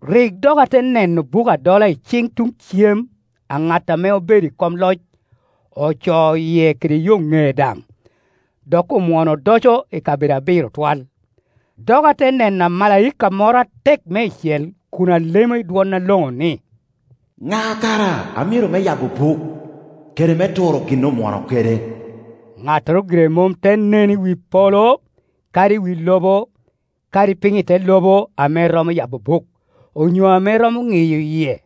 Rik dok ate neno buk adola i ciŋ tuŋ cem a ŋat ame obedo i kom Ocoo yie kede yo ŋee daŋ, dok omwono odoco i kabedo abiro twal. Dok ate neno amalaika moro atek meicel kun alemo i dwon aloŋo ni, “Ŋa kara a myero me yabo buk, kede me turo gin omwono kede?” Ŋattoro gire mom te nen i wi polo, kadi i wi lobo, kadi piny i te lobo ame romo yabo buk, onyo ame romo ŋiyo yie.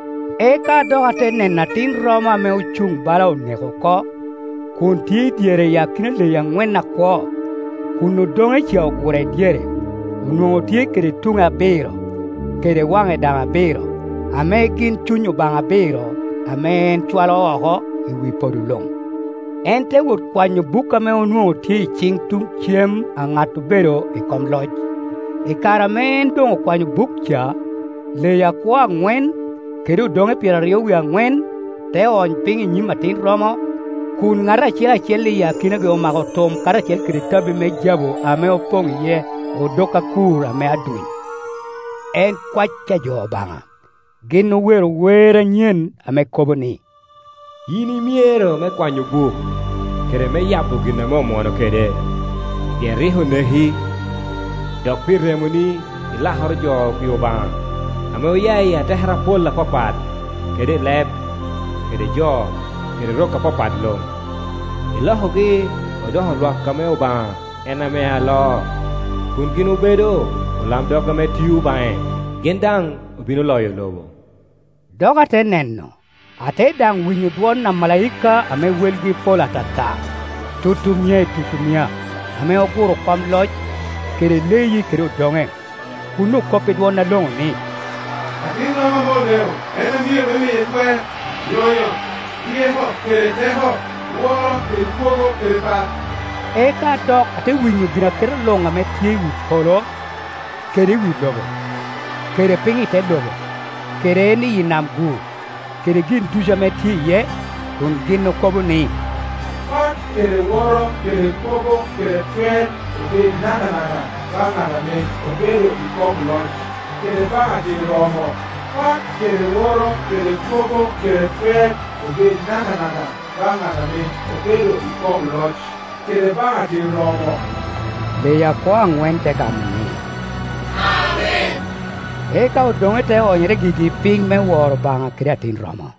Eka dok ate neno Atin romo ame ocuŋ bala oneko oko, kun tye i dyere, i akina leyi aŋwen akwo, kun odoŋe ca ogure dyere. Onwoŋo tye kede tuŋe abiro, kede waŋe daŋ abiro, ame gin cuny Obaŋa abiro, ame en cwalo oko i wi podo luŋ. En te wot kwanyo buk ame onwoŋo tye i ciŋ tuŋ cem a ŋat obedo i kom loc. I kare ame en doŋ okwanyo buk ca, leyi akwo aŋwen, kede odoŋe pyeraryo wie aŋwen, te ony piny i nyim Atin romo, kun ŋat acel acel i akinagi omako tum karacel kede tabbi me jabu ame opoŋ iye odok akur ame aduny, en kwae a jo Obaŋa. Gin owero wer anyen ame kobo ni, “Yin i myero me kwanyo buk, kede me yabo gin ame omwono kede, pien rik oneki, dok pi remoni ilakoro jo pi Obaŋa, ame oya i atekere apol apapat, kede i leb, kede jo, kede rok apapat luŋ, ilokogi odoko lwak ame Obaŋa en ame aloo, kun gin obedo olamdog ame tio baŋe, gin daŋ obino loyo lobo.” Dok ate neno, ate daŋ winyo dwon omalaika ame welgi pol atata, tutumia i tutumia, ame oguro kom loc, kede leyi kede odoŋe, kun okop i dwon aloŋo ni, “Atin romo ame oneko en a myero me miye twer, lonyo, ryeko kede teko, woro kede kwogo kede pak!” Eka dok ate winyo ginaketa luŋ ame tye iwi polo, kede i wi lobo, kede piny I te lobo, kede en iyi nam-gu, kede gin ducu ame tye iye, kun gin okobo ni, “Pak kede woro kede kwogo kede twer obed nakanaka baŋ ŋat ame obedo i kom loc, kede baŋ Atin romo!” “Pak kede woro kede kwogo kede twer obed nakanaka baŋ ŋat ame obedo i kom loc, kede baŋ Atin romo!” Leyi akwo aŋwen te gamo ni, “Amen!” eka odoŋe te onyere gigi piny me woro Obaŋa kede Atin romo.